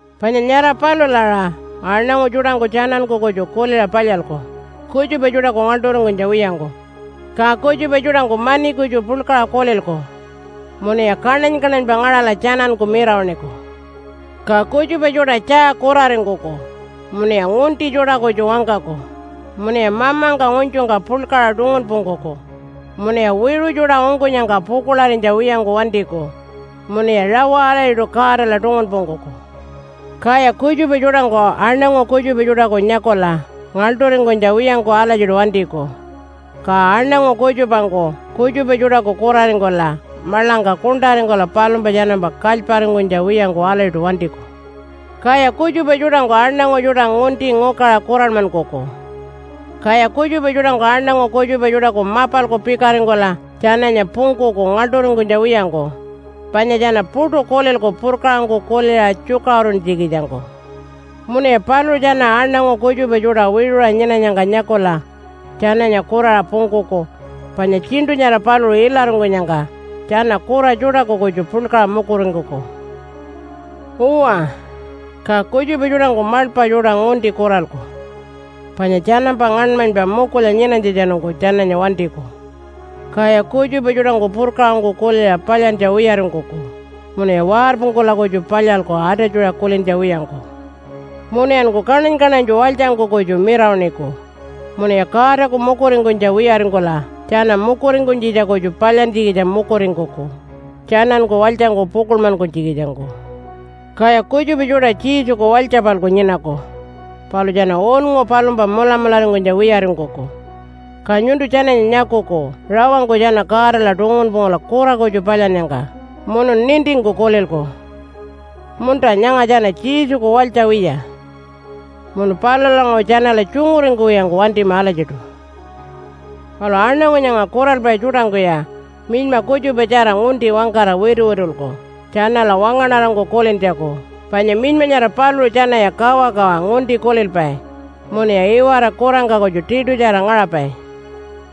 Panya nyara palula aṟa aṉangu tjuṯangku tjananku kutju kuliṟa palyalku, kutjupa tjuṯaku ngaḻṯuringkunytja wiyangku. Ka kutjupa tjuṯangku mani kutju puḻkaṟa kulilku, munuya kaṉany-kaṉanypa ngaṟala tjananku mirawaṉiku. Ka kutjupa tjuṯa tjaa kuraringkuku munuya ngunti tjuṯa kutju wangkaku, munuya mamangka ngunytjungka puḻkaṟa tungunpungkuku, munuya wiṟu tjuṯa ungkunyangka pukuḻarinytja wiyangku wantiku, munuya rawa alatjiṯu Godala tungunpungkuku. Kaya kutjupa tjuṯangku aṉangu kutjupa tjuṯaku nyakula ngaḻṯuringkunytja wiyangku alatjiṯu wantiku. Ka aṉangu kutjupangku kutjupa tjuṯaku kuraringkula maḻangka kuṉṯaringkula palumpa tjanampa kalyparingkunytja wiyangku alatjiṯu wantiku. Kaya kutjupa tjuṯangku aṉangu tjuṯa ngunti ngukaṟa kuranmankuku. Kaya kutjupa tjuṯangku aṉangu kutjupa tjuṯaku mapalku pikaringkula tjananya pungkuku ngaḻṯuringkunytja wiyangku, panya tjana puṯu kulilku purkaṟangku kuliṟa tjukaṟuruntjikitjangku. Munuya paluṟu tjana aṉangu kutjupa tjuṯa wiṟuṟa nyinanyangka nyakula tjananya kuraṟa pungkuku, panya tjiṉṯu nyara paluṟu ilaringkunyangka tjana kura tjuṯaku kutju puḻkaṟa mukuringkuku. Uwa, ka kutjupa tjuṯangku maḻpa tjuṯa ngunti kuralku panya tjanampa ngaṉmanypa mukulya nyinanytjatjanungku tjananya wantiku. Kaya kutjupa tjuṯangku purkaṟangku kuliṟa palyantja wiyaringkuku munuya warpungkula kutju palyalku atatjuṟa kulintja wiyangku. Munuyanku kaṉany-kaṉanytju walytjangku kutju mirawaṉiku, munuya Godaku mukuringkunytja wiyaringkula tjana mukuringkunytjitja kutju palyantjikitja mukuringkuku tjananku walytjangku pukuḻmankunytjikitjangku. Kaya kutjupa tjuṯa Jesuku walytja-palku nyinaku, palu tjana unngu palumpa mulamularingkunytja wiyaringkuku. Ka nyuntu tjananya nyakuku rawangku tjana Godala tungunpungkula kura kutju palyannyangka munun nintingku kulilku, “Munta, nyanga tjana Jesuku walytja wiya.” Munu palulanguṟu tjanala tjunguringkuwiyangku wantima alatjiṯu. Palu aṉangu nyanga kuralpai tjuṯangkuya minyma kutjupatjara ngunti wangkara wituwitulku tjanala wangaṉarangku kulintjaku. Panya minyma nyara paluṟu tjanaya kawakawa ngunti kulilpai, munuya iwara kurangka kutju tiṯutjara ngaṟapai.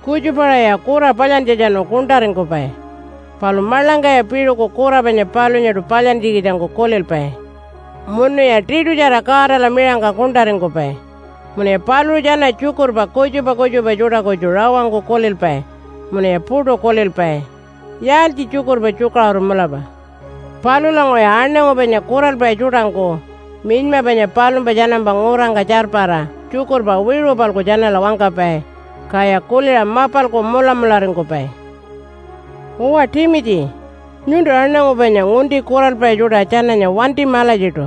Kutjupa-aṟaya kura palyantjatjanu kuṉṯaringkupai, palu maḻangkaya piṟuku kura panya palunyaṯu palyantjikitjangku kulilpai munuya tiṯutjara Godala miṟangka kuṉṯaringkupai. Munuya paluṟu tjana tjukurpa kutjupa kutjupa tjuṯa kutju rawangku kulilpai munuya puṯu kulilpai, “Yaaltji tjukurpa tjukaṟuru mulapa?” Palulanguṟuya aṉangu panya kuralpai tjuṯangku minyma panya palumpa tjanampa ngurangka tjarpara tjukurpa wiṟu-palku tjanala wangkapai, kaya kuliṟa mapalku mulamularingkupai. Uwa Timitji, nyuntu aṉangu panya ngunti kuralpai tjuṯa tjananya wantima alatjiṯu,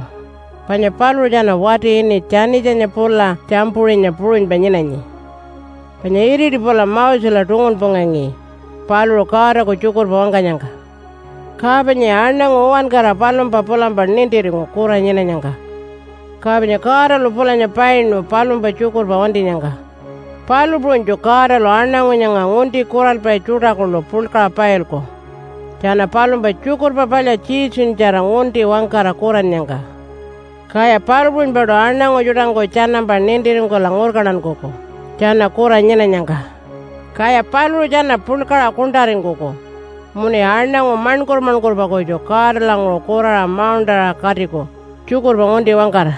panya paluṟu tjana wati ini Tjanitjanya pula Tjampuṟinya puṟunypa nyinanyi. Panya iriti pula Mosela tungunpungangi paluṟu Godaku tjukurpa wangkanyangka. Ka panyaya aṉangu uwankara palumpa pulampa nintiringu kura nyinanyangka, ka panya Godalu pulanya painu palumpa tjukurpa wantinyangka. Palu puṟunytju Godalu aṉangu nyanga ngunti kuralpai tjuṯa kuḻu puḻkaṟa pailku tjana palumpa Tjukurpa Palya Jesunyatjara ngunti wangkara kurannyangka. Kaya palu puṟunypaṯu aṉangu tjuṯangku tjanampa nintiringkula ngurkantankuku tjana kura nyinanyangka, kaya paluṟu tjana puḻkaṟa kuṉṯaringkuku munuya aṉangu maṉkur-maṉkurpa kutju Godalanguṟu kuraṟa mauṉṯaṟa katiku tjukurpa ngunti wangkara.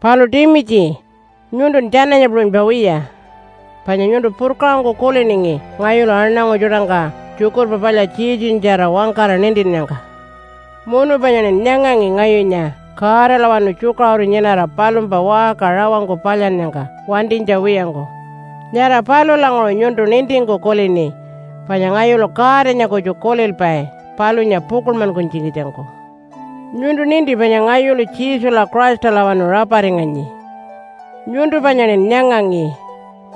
Palu Timitji nyuntun tjananya puṟunypa wiya. Panya nyuntu purkaṟangku kuliningi ngayulu aṉangu tjuṯangka Tjukurpa Palya Jesunyatjara wangkara nintinnyangka. Munu panyaṉin nyangangi ngayunya Godalawanu tjukaṟuru nyinara palumpa waṟka rawangku palyannyangka wantinytja wiyangku. Nyara palulanguṟu nyuntu nintingku kulini panya ngayulu Godanya kutju kulilpai palunya pukuḻmankunytjikitjangku. Nyuntu ninti panya ngayulu Jesula Christalawanu raparinganyi. Nyuntu panyaṉin nyangangi,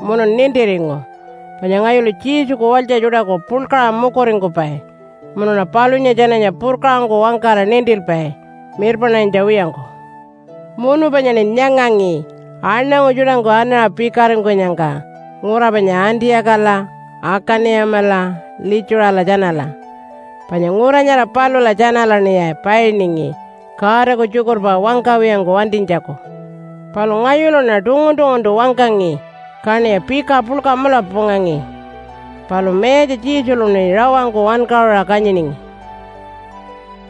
munun nintiringu panya ngayulu Jesuku walytja tjuṯaku puḻkaṟa mukuringkupai munuṉa palunya tjananya purkaṟangku wangkara nintilpai mirpaṉarinytja wiyangku. Munu panyaṉin nyangangi aṉangu tjuṯangku anaṟa pikaringkunyangka ngura panya Antiyakala, Akani-yamala, Litjuṟala tjanala. Panya ngura nyara palula tjanalaṉiya painingi Godaku tjukurpa wangkawiyangku wantinytjaku. Palu ngayuluṉa tungun-tunguntu wangkangi kaṉiya pika puḻka mulapa pungangi. Palu Mayatja Jesuluṉi rawangku wankaṟuṟa kanyiningi.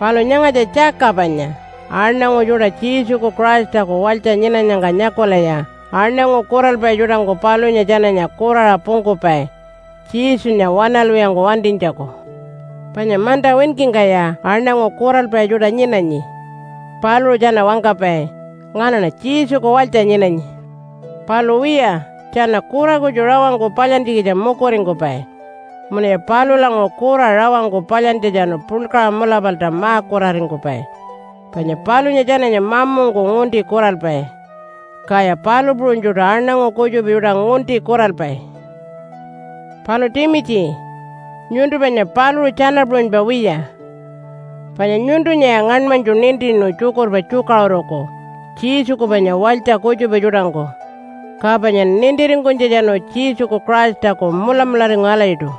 Palu nyangatja tjaka panya aṉangu tjuṯa Jesuku Christaku walytja nyinanyangka nyakulaya aṉangu kuralpai tjuṯangku palunya tjananya kuraṟa pungkupai Jesunya waṉalwiyangku wantinytjaku. Panya manta winkingkaya aṉangu kuralpai tjuṯa nyinanyi. Paluṟu tjana wangkapai, “Nganaṉa Jesuku walytja nyinanyi.” Palu wiya tjana kura kutju rawangku palyantjikitja mukuringkupai munuya palulanguṟu kura rawangku palyantjatjanu puḻkaṟa mulapalta ma-kuraringkupai. Panya palunya tjananya mamungku ngunti kuralpai, kaya palu puṟunytjuṯu aṉangu kutjupa tjuṯa ngunti kuralpai. Palu Timitji, nyuntu panya paluṟu tjana puṟunypa wiya. Panya nyuntunyaya ngaṉmanytju nintinu tjukurpa tjukaṟuruku Jesuku panya walytja kutjupa tjuṯangku, ka panyan nintiringkunytjatjanu Jesuku Christaku mulamularingu alatjiṯu.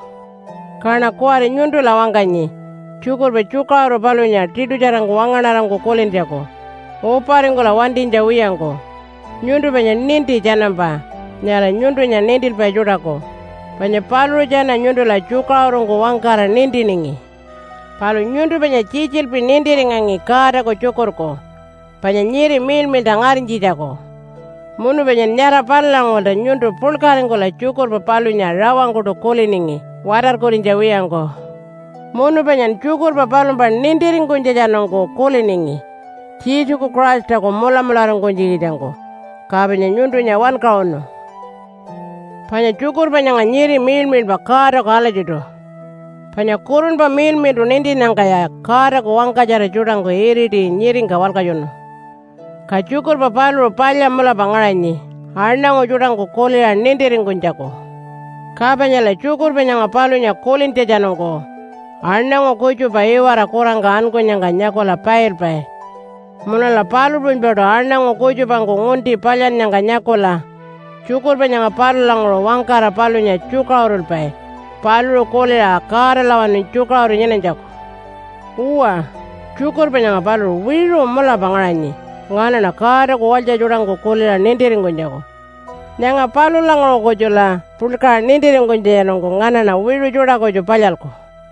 Kaṉa kuwari nyuntula wangkanyi tjukurpa tjukaṟuru palunya tiṯutjarangku wangaṉarangku kulintjaku uparingkula wantinytja wiyangku. Nyuntu panya ninti tjanampa nyara nyuntunya nintilpai tjuṯaku, panya paluṟu tjana nyuntula tjukaṟurungku wangkara nintiningi. Palu nyuntu panya tjitjilpi nintiringangi Godaku tjukurku panya nyiri miḻmiḻṯa ngarinytjitjaku. Munu panyan nyara palulanguṟulta nyuntu puḻkaringkula tjukurpa palunya rawangkuṯu kuliningi watarkurinytja wiyangku. Munu panyan tjukurpa palumpa nintiringkunytjatjanungku kuliningi Jesuku Christaku mulamularingkunytjikitjangku, ka panya nyuntunya wankaṟunu. Panya tjukurpa nyanga nyiri miḻmiḻpa Godaku alatjiṯu, panya Kurunpa Miḻmiḻṯu nintinnyangkaya Godaku wangkatjara tjuṯangku iriti nyiringka walkatjunu. Ka tjukurpa paluṟu palya mulapa ngaṟanyi aṉangu tjuṯangku kuliṟa nintiringkunytjaku. Ka panyala tjukurpa nyanga palunya kulintjatjanungku aṉangu kutjupa iwara kurangka ankunyangka nyakula pailpai. Munula palu puṟunypaṯu aṉangu kutjupangku ngunti palyannyangka nyakula tjukurpa nyanga palulanguṟu wangkara palunya tjukaṟurulpai paluṟu kuliṟa Godalawanu tjukaṟuru nyinanytjaku. Uwa, tjukurpa nyanga paluṟu wiṟu mulapa ngaṟanyi nganaṉa Godaku walytja tjuṯangku kuliṟa nintiringkunytjaku. Nyanga palulanguṟu kutjula puḻkaṟa nintiringkunytjatjanungku nganaṉa wiṟu tjuṯa kutju palyalku.